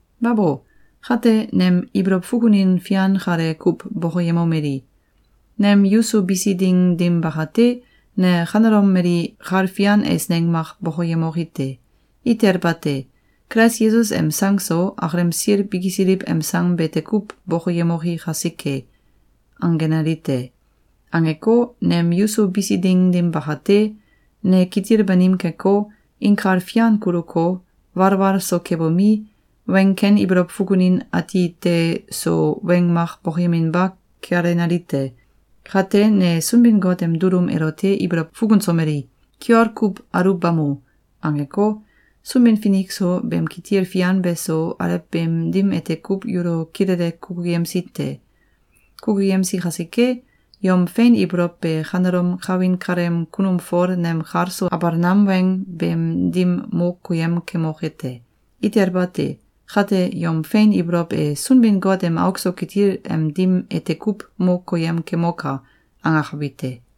Babo! Kate, nem ibolow fukunin fian kale kuw bokoyemomeli: “Nem yuso bisi ding dim bakate, ne kanelom mali kal fian eisneng mak bokoyemoki te! Itel bate! Kulais Yesus em sang so, akalem sil bikisiliw em sang bete kuw bokoyemoki kasike!”, angenali te. Angeko, nem yuso bisi ding dim bakate, ne kitil banim keko, inkal fian kuluko, walwal so kebomi, weng ken ibolow fukunin ati te so weng mak bokoyeminba kealenali te. Kate, ne Sunbin-Got em dulum elote ibolow fukunsomeli: “Kiol kuw aluwbamo!”, angeko, Sunbin-Finik so, beem kitil fian beso, alew beem dim ete kuw yulo kilele kukuyemsi te. Kukuyemsi kasike, yom fein ibolow be kanelom kawin kaleem kunum Fol nem kal so abal nam weng beem dim mo koyem kemoke te. Itel bate! Kate, yom fein ibolow e “Sunbin-Got em auk so kitil em dim ete kuw mo koyem kemoka!”, angakabi te.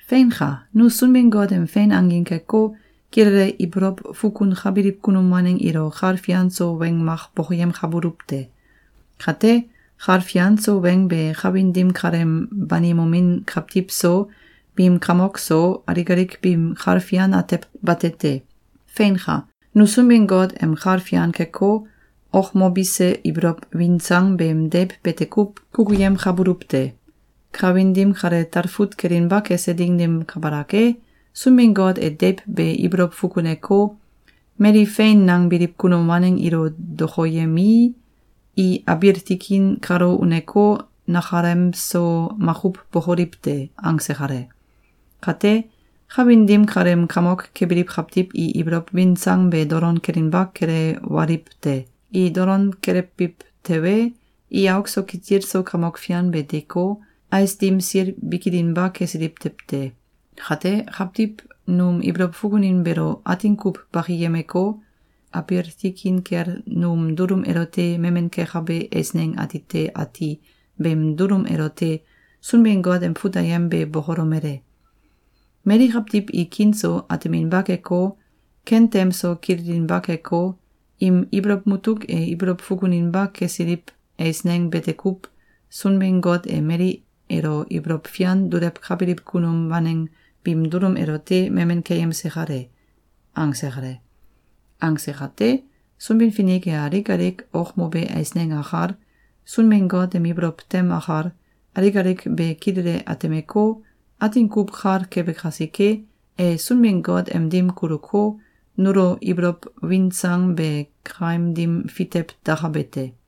Feinka! Nu Sunbin-Got em fein angin keko, kilele ibolow fukunkabiliw kunum waneng ilo kal fian so weng mak bokoyemkabuluw te. Kate, kal fian so weng be kawin dim kaleem banimomin kawtiw so, biim kamok so, alik alik biim kal fian atew bate te. Feinka! Nu Sunbin-Got em kal fian keko, okmobise ibolow win sang beem deiw bete kuw kukuyemkabuluw te. Kawin dim kale talfut kelinba kese ding dim kabalak e, Sunbin-Got e deiw be ibolow fukuneko, “Mali fein nangbiliw kunum waneng ilo dokoyemii, i abiil tikin kalo uneko, nakalemso makuw bokoliw te!”, angse kale. Kate, kawin dim kaleem kamok kebiliw kawtiw i ibolow win sang be dolon kelinba kelewaliw te. I dolon kelewbiw tewe, i auk so kitil so Kamok Fian be deeko, ais dim sil bikilinba kesiliw tew te. Kate, kawtiw num ibolow fukunin beelo atin kuw bakiyemeko, abiil tikin kel num dulum elote memen kekabe eisneng atite ati beem dulum elote Sunbin-Got em fut ayem be bokolomele: “Mali kawtiw i kiin so ateminba keko, ken tem so kililinba keko, im ibolow mutuk e ibolow fukuninba kesiliw eisneng bete kuw Sunbin-Got e mali elo ibolow fian dulewkabiliw kunum waneng biim dulum elote memen keyemse kale.”, angse kale. Angse kate, Sunbin-Finik e alik alik okmobe eisneng akal, Sunbin-Got em ibolow tem akal, alik alik be kilele atemeko, atin kuw kal kebe kasike, e Sunbin-Got em dim kuluko, nulo ibolow win sang be kaim dim fitew dakabe te.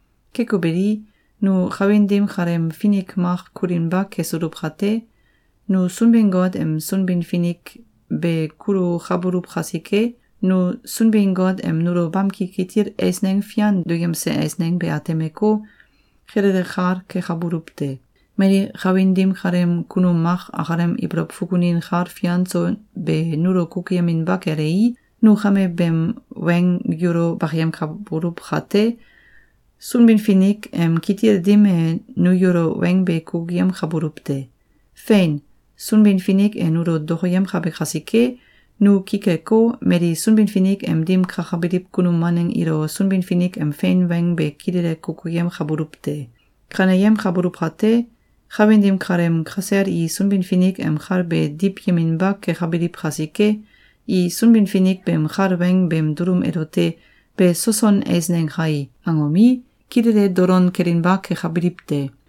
Keko beli, nu kawin dim kaleem finik mak kulinba kesuluw kate, nu Sunbin-Got em Sunbin-Finik be kulukabuluw kasike, nu Sunbin-Got em nulo bamki kitil eisneng fian duyemse eisneng be atemeko, kilele kal kekabuluw te. Mali kawin dim kaleem kunum mak akalem ibolow fukunin kal fian so be nulo kukuyeminba kelei, nu kame beem weng yulo bakayemkabuluw kate, Sunbin-Finik em kitil dim e nu yulo weng be kukuyemkabuluw te. Feinka! Sunbin-Finik e nulo dokoyemkabe kasike, nu ki keko, mali Sunbin-Finik em dim kakabiliw kunum waneng ilo Sunbin-Finik em fein weng be kilele kukuyemkabuluw te. Kaneyemkabuluw kate, kawin dim kaleem kasel i Sunbin-Finik em kal be diwyeminba kekabiliw kasike, i Sunbin-Finik beem kal weng beem dulum elote “Be soson eisneng kai!”, angomi, kilele dolon kelinba kekabiliw te.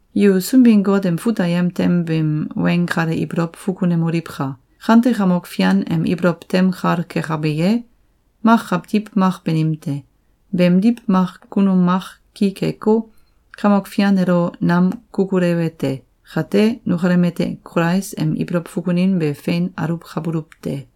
Yu Sunbin-Got em fut ayem tem beem weng kale ibolow fukunemoliwka! “Kante Kamok Fian em ibolow tem kal kekabe ye? Mak kawtiw mak banim te. Beemdiw, mak kunum mak ki keko, Kamok Fian elo nam kukulewe te.” Kate, nukalem ete Kulais em ibolow fukunin be fein aluwkabuluw te.